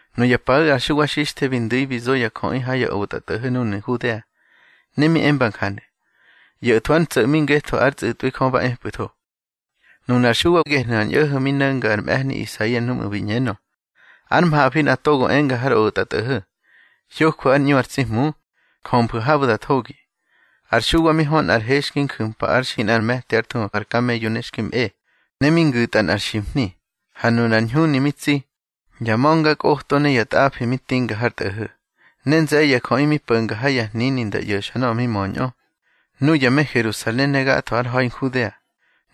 Nuya paꞌu̱ ar Xuwa Xixthe bi ndu̱i bi zo ya jöꞌi ha ya otꞌatꞌo̱ho̱ núnu̱ Nhudea. Ne mi emba njanu̱: —ꞌYo̱thwu̱ ár ntso̱ꞌmi ngetho ár tsꞌu̱tꞌwi Jö ba epꞌu̱tho. Nunar Xuwa gehnu̱ ar ñꞌo̱ho̱ mi no̱nga ar mꞌe̱hni Isaia núꞌmu̱ bi ꞌñenö: Ár mhafi nꞌa togo enga har otꞌatꞌo̱ho̱: Hyojwu̱ ár ꞌñu ar tsi Hmu. Jömfu̱ habu̱ da thogi. Ar Xuwa mi hö nꞌar he xki nju̱mpa ár xi nꞌar me̱ti ár thuhu ar kameyo ne xki mꞌe, ne mi ngu̱tꞌa nꞌar ximhni. Ha nunar ñhuni mi tsi, ya ma̱ngakꞌoto ne ya tꞌafi mi tinga har tꞌo̱ho̱. Ne nze̱ye̱ ya jöꞌi mi po̱nga ha ya hnini nda ꞌyo̱xa nöꞌö mi möñꞌö, nuya me Herusalen ne gatho har ha̱i Nhudea,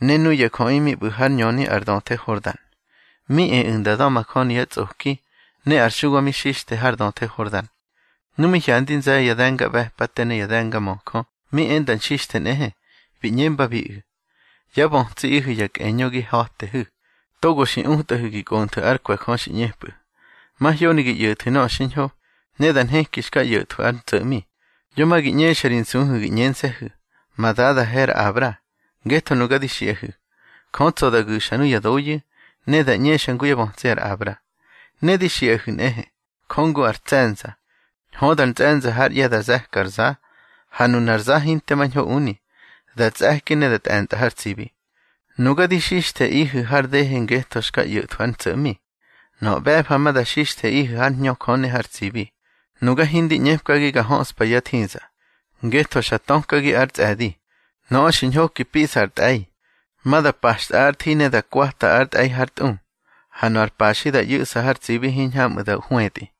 ne nuya jöꞌi mi ꞌbu̱ hár ñöni ar döthe Hordan. Mi eꞌu̱ nda da̱majöni yá tsꞌoki, ne ar Xuwa mi xixthe har döthe Hordan. Nu mi hyandi nze̱ye̱ ya de̱ngaꞌbe̱pate ne ya de̱ngamöjö mi e nda nxixthe nꞌehe, bi ꞌñembabiꞌu̱: —Yá bötsiꞌihu̱ ya kꞌeñö gi ha̱tehu̱. Togo xi utꞌahu̱ gi kꞌonthu̱ ár kwe̱ Jö xi ꞌñepꞌu̱. Mahyoni gi ꞌyo̱thu̱ nöꞌö xiñho, ne da nheki xka ꞌyo̱thwu̱ ár ntso̱ꞌmi. Yo ma gi ꞌñexa ri nsuhu̱ gi ꞌñense̱hu̱: Ma dadahe ar Abra. Ngetho nuga di xiꞌahu̱, Jö tsa̱ da gu̱xa nuya doyu̱, ne da ꞌñexa ngu yá bötsi ar Abra. Ne di xiꞌahu̱ nꞌehe, Jö ngu ar tse̱nza, höda ar ntsꞌe̱nza hár ꞌye̱ da ze̱ka ar za. Ha nunar za hinte mañho uni, da tsꞌe̱ki ne da tꞌe̱ntꞌa har tsibi. Nuga di xixtheꞌihu̱ har dehe ngetho xka ꞌyo̱thwu̱ ár ntso̱ꞌmi. Nöꞌö ꞌbe̱fa ma da xixtheꞌihu̱ hár Hñö Jö ne har tsibi. Nuga hindi ꞌñepkagi ga höꞌspa yá thiza, ngetho xa tökagi ár tsꞌe̱di. Nöꞌö xi ñhoki piꞌsa ar tꞌe̱i, ma da paxtꞌa ár thi ne da kwata ar tꞌe̱i hár tꞌu. Ha nöꞌö ar paxi da ꞌyu̱ꞌsa har tsibi hiñhamꞌu̱ da hwetꞌi.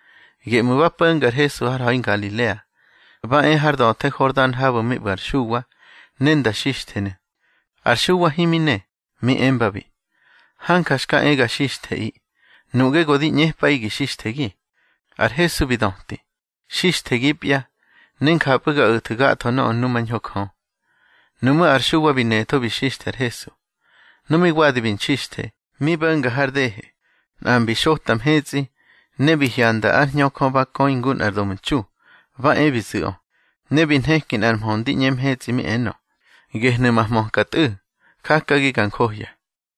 Geꞌmu̱ ba po̱nga ar Hesu har ha̱i Ngalilea, ba e har döthe Hordan habu̱ mi ꞌbu̱ ar Xuwa, ne nda xixthenu̱. Har Xuwa himi ne, mi embabi: —Hanja xka e ga xixtheꞌi. Nuꞌge go di ꞌñepꞌaꞌi gi xixthegi. Har Hesu bi döti: —Xixthegipya, ne njapꞌu̱ ga o̱thu̱ gatho nöꞌö numañho Jö. Nuꞌmú̱ ar Xuwa bi netho bi xixthe ar Hesu. Nu mi wadi bi nxixthe, mi bo̱nga har dehe, nꞌa mbi xota mhetsꞌi, ne bi hyanda ár Hñö Jö ba köi ngu nꞌar domtxu, ba e bi zu̱ꞌö. Ne bi nheki nꞌar mhö ndi ꞌñe mhetsꞌi mi enö: —Gehnu̱ ma hmöka Tꞌu̱, jakagi ga njohya.